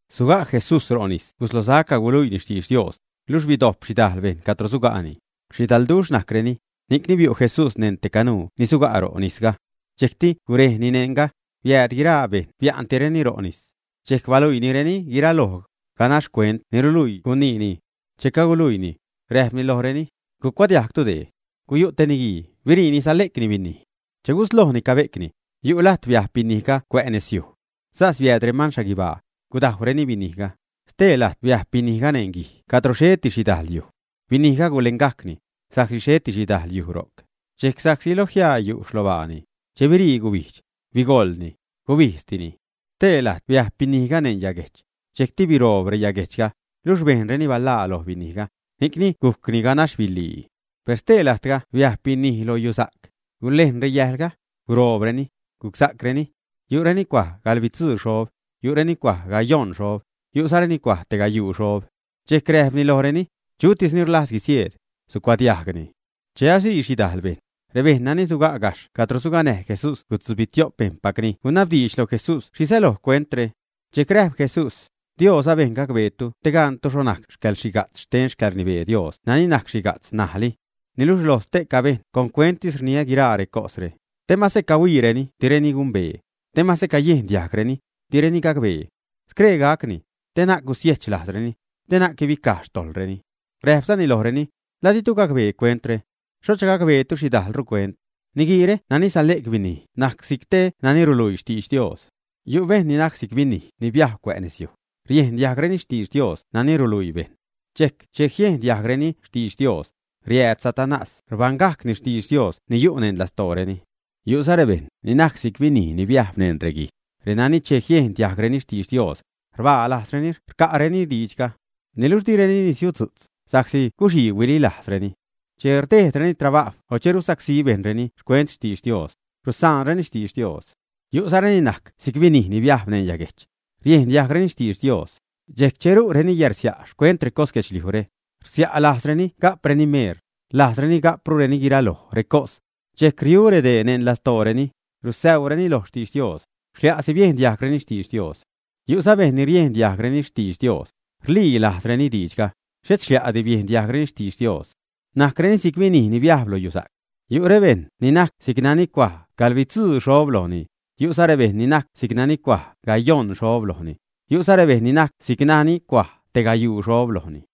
Suga' Jesús ro' nis guslosac caguluiini xtidx Dios, luxh bidojp xhidajl bejṉ cadro suga'ni. Xhidalduxh najcreni, ni'cni biu' Jesús neṉ te canuu ni suga' ro' nisga. Dxejcti gurejni neṉga, biääd guiraa bejṉ bia'ntireni ro' nis. Dxejc baluiinireni guiraloj, ganax cuent ni ruluii guniini. Che caguluiini, räjpni lojreni: ―Gucuadiajgtu dee. Guyu' te niguii. Biriini sale'cni binij. Che guslojni cabe'cni, yu' lajt biajb binijga cuä' nezyuj. Sas biääd reman xhaguibaa, gudajwreni binijga. Stee lajt biajb binijga neṉ guij cadro xheti xhidal yuj. Binijga gulengajcni, sa'csi xheti xhidajl yuj ro'c. Dxejc, sa'csi lo jiaa yu' xlobaani, che birii gubijdx, bigoḻni, gubijdztini. Stee lajt biajb binijga neṉ yaguejch. Dxejcti biroob reyaguejchga, luxh bejnreni balaa loj binijga, ni'cni gujcni ganax biḻii. Per stee lajtga biajb binij lo yusa'c. Gulejn reyäjlga, guroobreni, gucsa'creni. Yu'reni cuaj gaḻbitzuu xob, yu'reni cuaj gayojṉ xob, yu'zareni cuaj tegayuu xob. Dxejc räjpni lojreni: ―Chutis ni rlajz guisieed, sucuadiajgni. Che asii xhidajl bejṉ, rebejṉ nani suga' gajxh cadro suganäj Jesús guitzubitio'p xpejṉpacni gunabdiidx lo Jesús xhi säloj cuentre. Dxejc räjp Jesús: ―Dios abejn gacbeetu te gantu xho najc yäḻxhiga'tz xten xcäḻrnibee Dios nani najc xhiga'tz ṉajli. Niluxh lo ste'ca bejṉ con cuenttis rniä guiraa recosre, te mase cahuiireni direni gumbee, te mase cayiejn diajgreni, direni gacbee. Scree gacni, te na'c gusiejch lajzreni, te na'c guibicaj xtojḻreni. Räjpzani lojreni: ―¿La ditu gacbee cuentre? ¿Xhocha gacbeetu xhidajlru cuent? Niguiire nani sale'c binij najc si'c te nani ruluii xtidx Dios. Yu' bejṉ ni najc si'c binij ni biajb cuä' nezyuj: riejn diajgreni xtidx Dios nani ruluii bejṉ. Dxejc che jiejn diajgreni xtidx Dios, riääd Satanás rbägajcni xtidx Dios ni yu' neṉ lastooreni. Yu'za rebejṉ ni najc si'c binij ni biajb neṉ reguij, renani che jiejn diajgreni xtidx Dios, rbaa lajzreni rca'reni diidxga. Niluxh direni nisiudzu'tz, sa'csi guxii huilii lajzreni. Che rdejdreni trabajw o che rusacsí bejṉreni xcuent xtidx Dios, rusaanreni xtidx Dios. Yu'zareni najc si'c binij ni biajb neṉ yaguejch, riejn diajgreni xtidx Dios, dxejc che ru'rureni yärsia' xcuent recos guedxliujre, rsia' lajzreni ga'preni meel, rlajzreni ga'prureni guiraloj recos, dxejc riu' redee neṉ lastooreni, rusäuuni lo xtidx Dios, xlia'si biejn diajgreni xtidx Dios. Yu'za bejṉ ni riejn diajgreni xtidx Dios, rlii lajzreni diidxga, xhet xlia'ti biejn diajgreni xtidx Dios. Najcreni si'c binij ni biajb loj yusa'c. Yu' rebejṉ ni najc si'c nani cuaj gaḻbitzuu xob lojni, yu'za rebejṉ ni najc si'c nani cuaj gayojṉ xob lojni, yu'za rebejṉ ni najc si'c nani cuaj tegayuu xob lojni.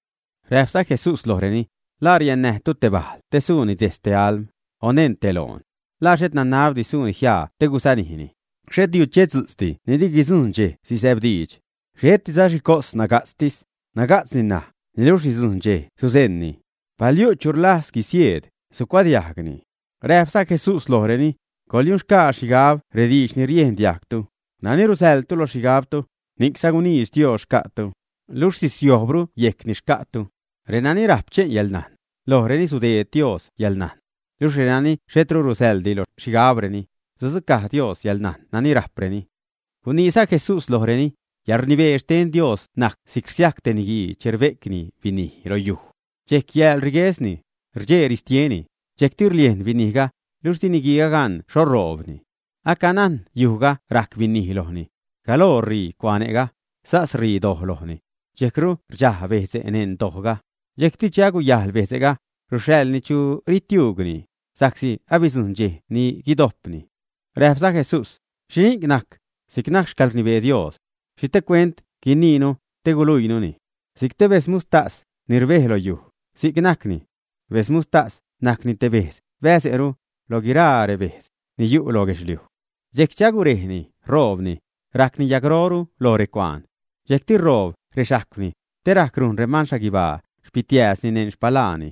Räjpza Jesús lojreni: ―¿La riädnätu te bajl te suuni dejtz te alm, o neṉ te loon, ä? ¿La xhet nanabdi suuni jiaa te guzanijni, ä? Xhet yuchetzu'tzdi ni di guidzujṉ dxej sisäbdiidx. Xhetiza xhicos naga'tztis. Naga'tzni ṉaj, niluxh sidzujṉ dxej sule'ni. Pal yu' chu rlajz guisieed, sucuadiajgni. Räjpza Jesús lojreni: ―Coḻyunxgaa xhigab rediidx ni riejn diajgtu. Nani rusäḻtu loj xhigabtu, ni'cza guniidx Dios xca'tu, luxh sisiojbru yejc ni xca'tu. Renani rajp che'n yäḻnajn, lojreni sudeedru Dios yälnajn. Luxh renani xhetru rusäḻdi loj xhigabreni, sudzucaj Dios yäḻnajn nani rajpreni. Guniiza Jesús lojreni: ―Yäḻrnibee xten Dios najc si'c rsiajc te niguii che rbe'cni binij lo yuj, dxejc yääl riguesni, rdxee ristieni, dxejcti rliejn binijga, luxh di niguiiga gan xho ṟoobni. Acanajn yujga rajc binij lojni. Galoo ṟii cuane'ga, sas ṟii doj lojni. Dxejcru rdxaj bejdze' neṉ dojga. Dxejcti che aguyajl bedze'ga, ruxhaḻni chu ritiuugni, sa'csi abidzujṉ dxej ni guidojpni. Räjpza Jesús: ―¿Xhini'c najc si'c najc xcäḻrnibee Dios? ¿Xhi te cuent guiniinu te guiluiinuni? Si'c te bedz muxhtas ni rbej loyuj, si'c najcni. Bedz muxhtas najcni bedz bäze'ru loj guiralii bedze' ni yu' loj guedxliuj. Dxejc che agurejni, ṟoobni, rajcni yagroru loj recuaan. Dxejcti ṟoob rexajcwni te rajc rujn reman xhaguibaa xpitiääzni neṉ xpaḻaani.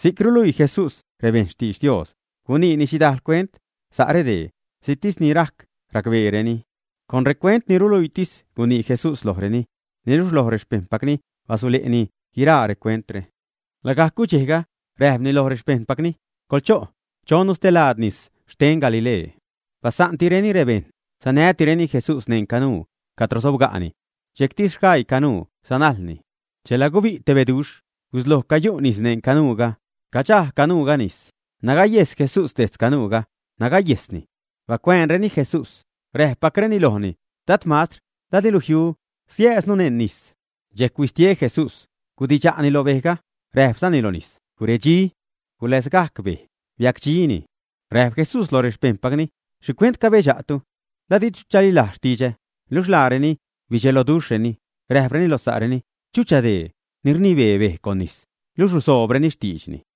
Si'c ruluii Jesús rebejṉ xtidx Dios guniini xhidal cuent sa' redee, si'ctis ni rajc racbeereni. Con recuent ni ruluiitis gunii Jesús lojreni. Niluxh lo rexpejṉpacni basule'ni guiraa recuentre. Lagajc gudxejga räjpni loj rexpejṉpacni: ―Coḻcho', chonnu stelaad nis xten Galilee. Basa'ntireni rebejṉ, sanätireni Jesús neṉ canuu cadro sobgajcni. Dxejcti sgaii canuu sanajlni. Chela gubi' te beduxh, gusloj cayu' nis neṉ canuuga. Cadxaj canuuga nis. Nagayejs Jesús dejtz canuuga, nagayejsni. Bacuäänreni Jesús, räpgajcreni lojni: ―Dad mastr, ¿la dilu jiu siääznu neṉ nis, ä? Dxejc huistie Jesús, gudidxa'ni lo bejga, räjpzani lo nis: ―Guredxi. Guläzgajc bej, biacdxini. Räjp Jesús loj rexpejṉpacni: ―¿Xhicuent cadxebduxhtu? ¿La ditu chalilajz xtidxä, ä? Luxh laareni bidxelojreni, räjpreni loj sa'reni: ―¿Chucha dee ni rnibee bej con nis, luxh ruzoobreni xtiidxni?